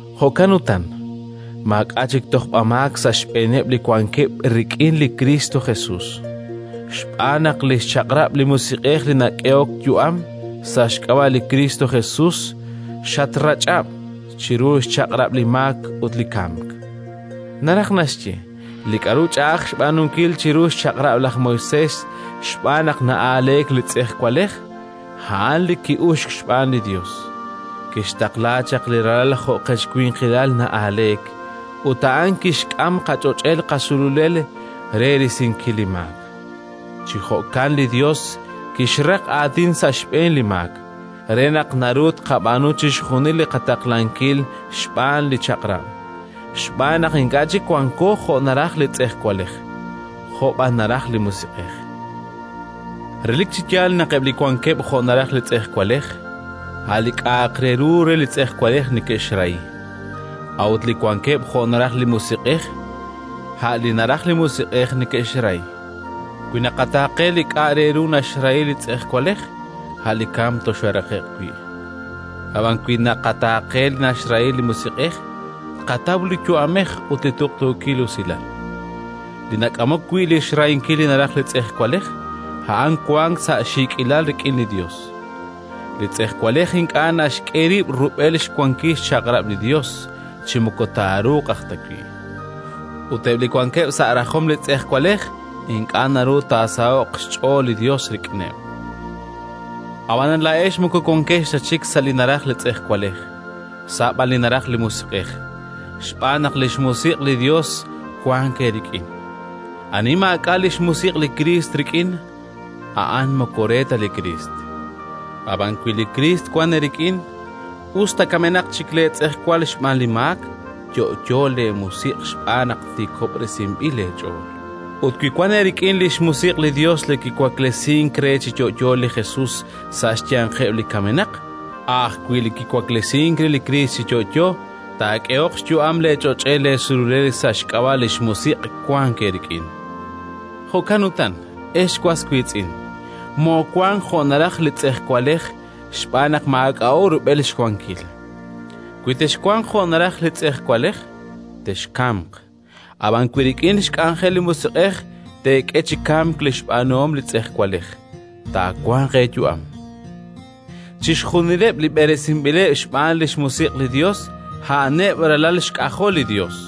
Jo'kan utan, maak'a' chik tojb'amaak sa' xb'eeneb' li wankeb' rik'in li Kristo Jesus. Xb'aan naq li xchaq'rab' li Musiq'ej li nak'ehok yu'am sa' xk'ab'a' li Kristo Jesus xatrach'ab' chiru xchaq'rab' li maak ut li kamk. Naraj naxye, li k'aru ch'a'aj xb'aanunkil chiru xChaq'rab' laj Moisés xb'aan naq na'aaleek li tz'ejwalej, a'an li ki'uxk xb'aan li Yos: kixtaqla chaq li Ralal jo' qech winqilal na'aaleek, ut a'an kixk'am qach'och'el qasululel, re risinkil li maak. Chi jo'kan li Yos kixraq aatin sa' xb'een li maak re naq naru tqab'aanu chixjunil li qataqlankil xb'aan li Chaq'rab', xb'aan naq ink'a' chik wanko jo' naraj li tz'ejwalej, jo' b'an naraj li Musiq'ej. Relik chi yaal naq eb' li wankeb' jo' naraj li tz'ejwalej, a' li k'a'aq re ru re li tz'ejwalej neke'xrahi; a'ut li wankeb' jo' naraj li musiq'ej, a' li naraj li musiq'ej neke'xrahi. Wi naqataaqe li k'a' re ru naxrahi li tz'ejwalej, a' li kamk toxooraqe'q wi'; ab'an wi naqataaqe li naxrahi li musiq'ej, tqataw li yu'amej ut li tuqtuukil usilal. Li nak'amok wi' li xrahinkil li naraj li tz'ejwalej, a'an wank sa' xiik'ilal rik'in li Yos: li tz'ejwalej ink'a' naxk'e rib' rub'el xwankil xchaq'rab' li Yos, chi moko taaruuq aj ta wi'; ut eb' li wankeb' sa' rajom li tz'ejwalej, ink'a' naru taasaho'q xch'ool li Yos rik'ineb'. Ab'anan laa'ex moko wankex ta chik sa' li naraj li tz'ejwalej, sa' b'an li naraj li musiq'ej, xb'aan naq li xMusiq' li Yos wank eerik'in. Ani maak'a' li xMusiq' li Kriist rik'in, a'an moko re ta li Kriist. Ab'an wi li Kriist wank eerik'in, us ta kamenaq chik leetz'ejwal xb'aan li maak, yo'yo leemusiq' xb'aan naq tiikob'resinb'il leech'ool. Ut wi wank eerik'in li xMusiq' li Yos li kiwaklesink re chi yo'yo li Jesus sa' xyanqeb' li kamenaq, a' ajwi' li kiwaklesink re li Kriist chi yo'yo taak'ehoq xyu'am leech'och'el leesululel sa' xk'ab'a' li xMusiq' wank eerik'in. Jo'kan utan, ex was wiitz'in, moowank jo' naraj li tz'ejwalej, xb'aan naq maak'a'o rub'el xwankil: wi texwanq jo' naraj li tz'ejwalej, texkamq; ab'an wi rik'in xk'anjel li Musiq'ej teek'e chi kamk li xb'aanuhom li tz'ejwalej, taawanq eeyu'am. Chixjunileb' li b'eresinb'ileb' xb'aan li xMusiq' li Yos, a'aneb' ralal xk'ajol li Yos.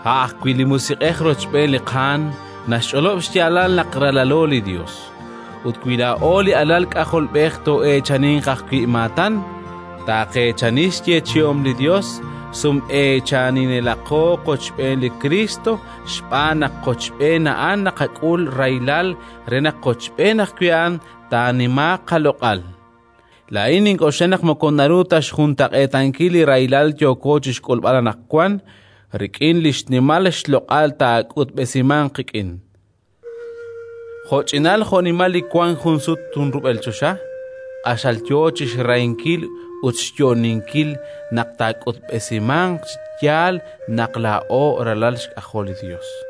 A' ajwi' li Musiq'ej rochb'een li qaanm naxch'olob' xyaalal naq ralalo li Yos. Ut wi laa'o li alal k'ajolb'ej, too'eechaninq ajwi' maatan, taaqeechani xyeechi'om li Yos, sum'eechaninelaqo qochb'een li Kriist, xb'aan naq qochb'een A'an naqak'ul rahilal re naq qochb'een ajwi' A'an taanimaaq qaloq'al. Laa'in nink'oxla naq moko naru ta xjuntaq'eetankil li rahilal yooko chi xk'ulb'al anaqwan rik'in li xnimal loq'al taak'utb'esimanq qik'in. Jo'ch'inal jo'nimal li wank junsut junrub'el choxa q'axal yo chi xrahinkil ut xyo'oninkil naq taak'utb'esimanq chi yaal naq laa'o ralal xk'ajol li Yos.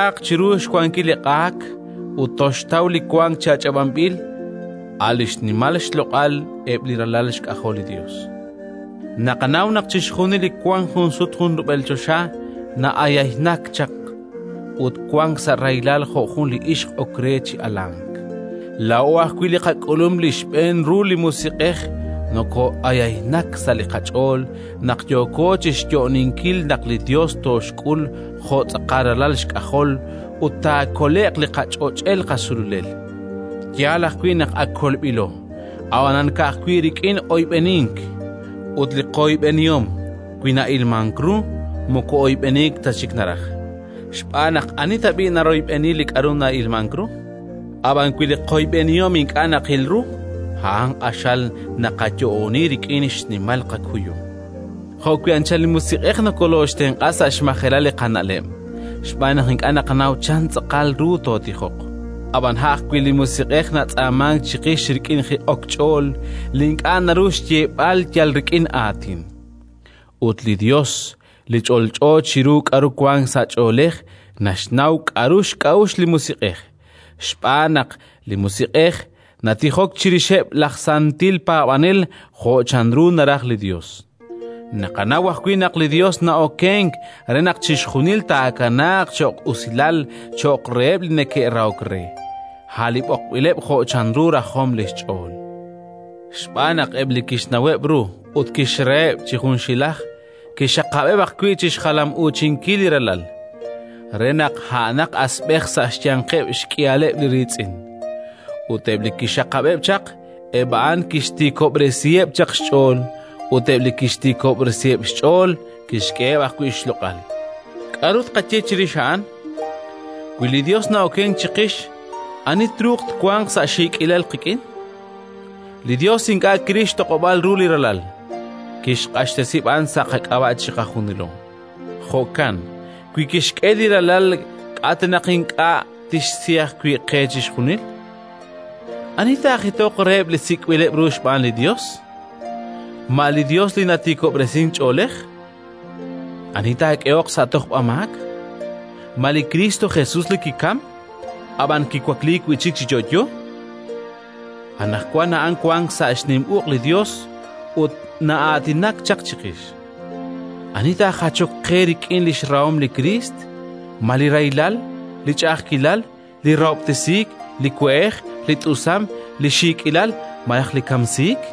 naq taa'ach'ab'aaq chiru xwankil li q'aak ut toxtaw li wank chi ach'ab'anb'il, a' li xnimal xloq'al eb' li ralal xk'ajol li Yos. Naqanaw naq chixjunil li wank junsut junrub'el choxa na'ayaynak chaq ut wank sa' rahilal jo' jun li ixq ok re chi alank. Laa'o ajwi' li qak'ulum li xb'een ru li Musiq'ej nokoo'ayaynak sa' li qach'ool, naq yooko chi xyo'oninkil naq li Yos tooxk'ul jo' tz'aqal ralal xk'ajol ut taakole'q li qach'och'el qasululel. Yaal ajwi' naq ak kolb'ilo, ab'anan ka'ajwi' rik'in oyb'enink; ut li qoyb'enihom, wi na'ilmank ru, moko oyb'eniik ta chik naraj, xb'aan naq ani tab'i' naroyb'eni li k'aru na'ilmank ru? Ab'an wi li qoyb'enihom ink'a' naqil ru, a'an q'axal naqayo'oni rik'in xnimal qakuyum. Jo'wi' anchal li Musiq'ej nakoloxtenq'a sa' xmajelal li qana'leb', xb'aan naq ink'a' naqanaw chan tz'aqal ru tootijoq. Ab'an a' ajwi' li Musiq'ej natz'aamank chiqix rik'in jiq'ok ch'ool li ink'a' naru xyeeb'al yal rik'in aatin. Ut li Yos, li ch'olch'o chiru k'aru wank sa' ch'oolej, naxnaw k'aru xk'a'uxl li Musiq'ej, xb'aan naq li Musiq'ej natijok chirixeb' laj santil paab'anel jo' chanru naraj li Yos. Naqanaw ajwi' naq li Yos na'okenk re naq chixjunil taakanaaq cho'q usilal cho'q reheb' li neke'rahok re, a' li b'oqb'ileb' jo' chanru rajom li xch'ool. Xb'aan naq eb' li kixnaweb' ru ut kixraheb' chi junxilaj, kixxaqab'eb' ajwi' chi xjalam'uuchinkil li Ralal, re naq a'anaq asb'ej sa' xyanqeb' xk'ihaleb' li riitz'in. Ut eb' li kixxaqab'eb' chaq, eb' a'an kixtiikob'resiheb' chaq xch'ool; ut eb' li kixtiikob'resiheb' xch'ool, kixk'eheb' ajwi' xloq'al. K'aru tqaye chirix a'an? Wi li Yos na'okenk chiqix, ani truuq twanq sa' xiik'ilal qik'in? Li Yos ink'a' kiril xtoq'ob'aal ru li Ralal, kixq'axtesi b'an sa' qak'ab'a' chiqajunilo. Jo'kan wi kixk'e li Ralal, k'a' ta naq ink'a' tixsi ajwi' qe chixjunil? Ani taajitoq reheb' li sik'b'ileb' ru xb'aan li Yos? Ma li Yos li natiikob'resink ch'oolej? Ani taak'ehoq sa' tojb'amaak? Ma li Kristo Jesus li kikamk, ab'an kiwakliik wi' chik chi yo'yo? Anaqwan a'an wank sa' xnim uq' li Yos ut na'aatinak chaq chiqix. Ani taajachoq qe rik'in li xrahom li Kriist? Ma li rahilal, li ch'a'ajkilal, li rahob'tesiik, li we'ej, li t'usam, li xiik'ilal malaj li kamsiik?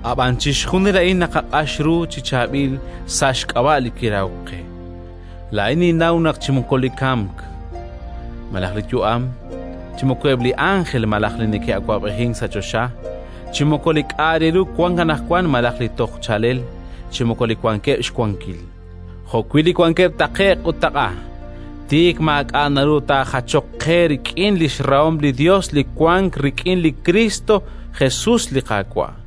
Ab'an chixjunil a'in naqaq'ax ru chi chaab'il sa' xk'ab'a' Li kirahok qe. Laa'in ninnaw naq chi moko li kamk malaj li yu'am, chi moko eb' li ánjel malaj li neke'awab'ejink sa' choxa, chi moko li k'a' re ru wank anaqwan malaj li toj chaalel, chi moko li wankeb' xwankil, jo'wi' li wankeb' taqe'q ut taq'a, tik maak'a' naru taajachoq qe rik'in li xrahom li Yos li wank rik'in li Kristo Jesus, li Qaawa'.